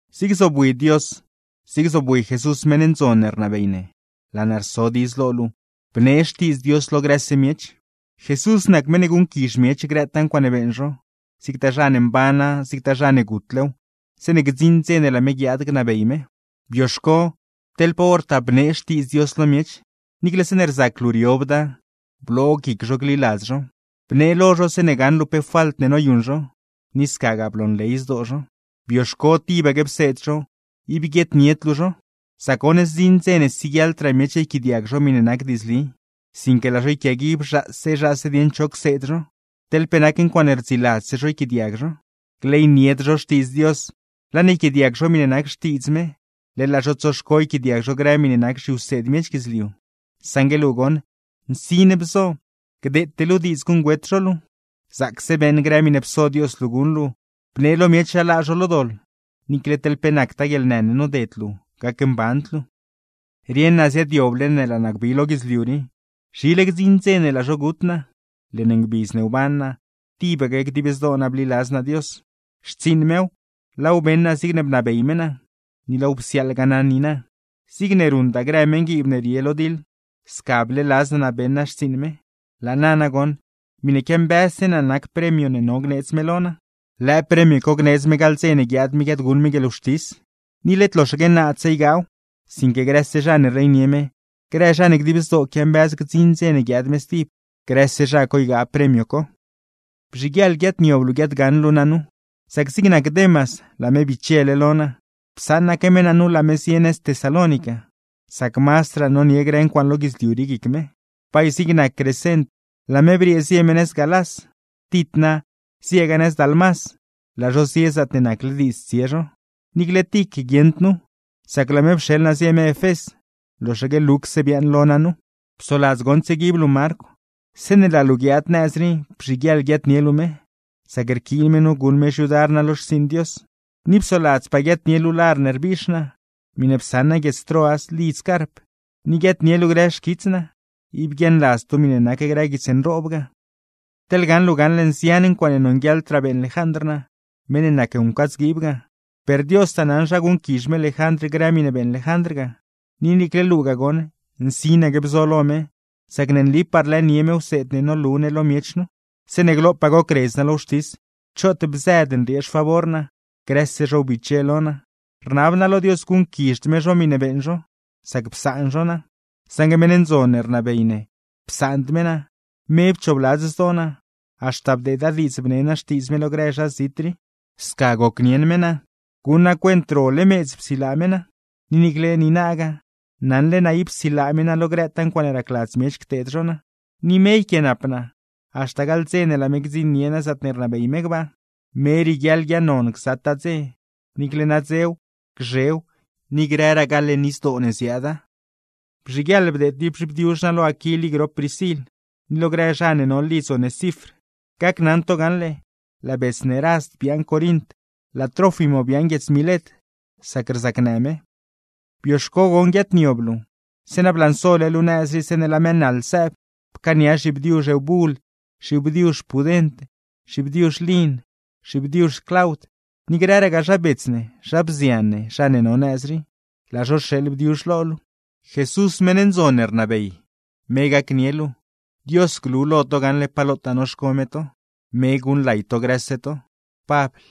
Zig zobwi Dios, zig zobwi Jesús meṉ ndzon ne rnabey ne, laa naa rso diidz lo luu, bnee Xtiidz Dios lo grëse miech. (Jesús nac meṉ guṉquizh miech grëtaa ncuaaṉe beeṉ zho, zigtaa zha ne mbana zigtagaa zha ne gutlew, zeeṉe gdziṉ dze ne laa me guiaad gnabey me.) Bioxco teḻ pa hortaa bneew lo zho, niicle zeeṉe rzac luu riobda. Bloo guic zho gliladz zhow, bnee lo zho zeeṉe gaṉ luu pe falt ne noyuṉ zho, ni scagaa bloonley zdoo zho. Bioxco tibaque pseed zho, ib guieednied luu zho. Sac goṉ, zdziṉ dze ne siguieḻdraa miech yquiaadiag zho miṉe nac diidzli; sinque laa zho yquiaguib zhaase zhaase dieṉ cho cseed zho teḻ pe nac ncuaaṉe rdziladzse zho yquiaadiag zho. Gleynied zho Xtiidz Dios, laa ne yquiaadiag zho miṉe nac xtiidz me, leḻ laa zho tsoxco yquiaadiag zho grë miṉe nac zhiwseed miech guidzliu. Saṉgue luu goṉ, nsin bzo gdeete luu diidz guṉgüet zho luu. Zaacse beeṉ grë miṉe pso Dios luu guṉ luu, bnee lo miech zha laa zho lo doḻ; niicle teḻ pe nactaa guieḻnë ne noded luu, gacmband luu. Rieṉ naa ziaadyoble ne laa naa gbi lo guidzliu rii, zhile gdziṉ dze ne laa zho gut naa. Leṉ ngbidz ne wban naa, tibaque dib zdoo naa bliladz naa Dios; xtsiiṉ mew, laaw beṉ naa zigne bnabey me naa, ni laaw psiaaḻgaa naa niina. Zigne ruṉda grë meṉguiib ne rie lo diḻ, sca bleeladz naa naa beṉ naa xtsiiṉ me; laa na nagoṉ, miṉe quiambëzse naa nac premio ne no gneedz me lo naa. Lëë premio co gneedz me gaḻ dze ne guiaad me guiaadguṉ me guieḻwxtis; ni led loxaque naadse ygaaw, sinque grëse zha ne rleynie me, grë zha ne dib zdoo quiambëz gdziṉ dze ne guiaad me stib, grëse zha co ygaa premio co. Bzhiguieḻ guiaadniob luu guiaadgaṉ luu naa nu; sac zig nac Demas, laa me bichele lo naa. Psaṉaque me naa nu laa me zie nëz Tesalónica; sac mazdraa nonie grë ncuaaṉe lo guidzliu rii guic me. Bay zig nac Crescent, laa me briee zie me nëz Galás; Tit na, zieegaa nëz Dalmás; laa zho zie zaatne nacle diidz tsie zho. Niicle Tic guieṉd nu, sac laa me pxeḻ naa zie me Efés. Loxaque Lucse biaaṉ lo naa nu. Psoladz goṉ tsieguib luu Marcw, zeeṉe laa luu guiaad nëz rii bzhiguieḻ guiaadnie luu me; sac rquiin me nu guṉ me xyudar naa lo xtsiiṉ Dios. Ni psoladzpaa guiaadnie luu lar ne rbiix naa, miṉe psaṉ naa guiedz Troas lidz Carp; ni guiaadnie luu grë xquits naa. Ib guiaaṉladzd luu miṉe nac grë guits nroob ga. Teḻ gaṉ luu gaṉle nzian ncuaaṉe nonguieḻdraa beeṉ Lejandr naa, meṉ ne nac wncadzguiib ga; per Diostaa naṉ zha guṉquizh me Lejandr grë miṉe beeṉ Lejandr ga. Ni niicle luugaa goṉ, nsinaque bzo lo me; sac ne nlipaa rlëënie me wseed ne nolu ne lo miech nu. Zeeṉe glopaa gocredz naa lo wxtis, choot bzëd nriee xfavor naa, grëse zho biche lo naa; rnab naa lo Dios guṉquizhd me zho miṉe beeṉ zho, sca psaan zho naa. Saṉgue meṉ ndzon ne rnabey ne psaand me naa, me pchoobladz zdoo naa, haxta bdeeda diidz bnee naa Xtiidz me lo grë zha zit rii. Sca gocnieṉ me naa, guṉ naa cuent role meedz psilaa me naa; ni niicle niinagaa, naṉle naa ne ib silaa me naa lo grëtaa ncuaaṉe racladz miech cteed zho naa, ni me yquiaanap naa haxta gaḻ dze ne laa me gdziṉnie naa zaatne rnabey me gbaa. ¡Me rieguiaḻ guiaaṉnon gzataa dze, niicle nadzew, gzhew, ni grëragaa leṉ izdoo ne ziaada! Bzhiguieḻ bdeed tib zhibdiuzh naa lo Aquil i grop Priscil, ni lo grë zha ne no lidz Onesifr. Gacnaṉ to gaṉle, laa bets ne Rast biaaṉ Corint, laa Trófimo biaaṉ guiedz Milet, sac rzacnë me. Bioxco goṉ guiaadniob luu, zeeṉa blansole luu nëz rii zeeṉe laa mëë naḻ sëëb. Pcaania zhibdiuzh Eubul, zhibdiuzh Pudent, zhibdiuzh Lin, zhibdiuzh Claud; ni grëragaa zha bets ne, zha bzian ne, zha ne no nëz rii, laa zho rxeeḻ bdiuzh lo luu. Jesús meṉ ndzon ne rnabey, me gacnie luu. Dios glu lo to gaṉle pa lotaa noxco me to. ¡Me guṉlay to grëse to! Pabl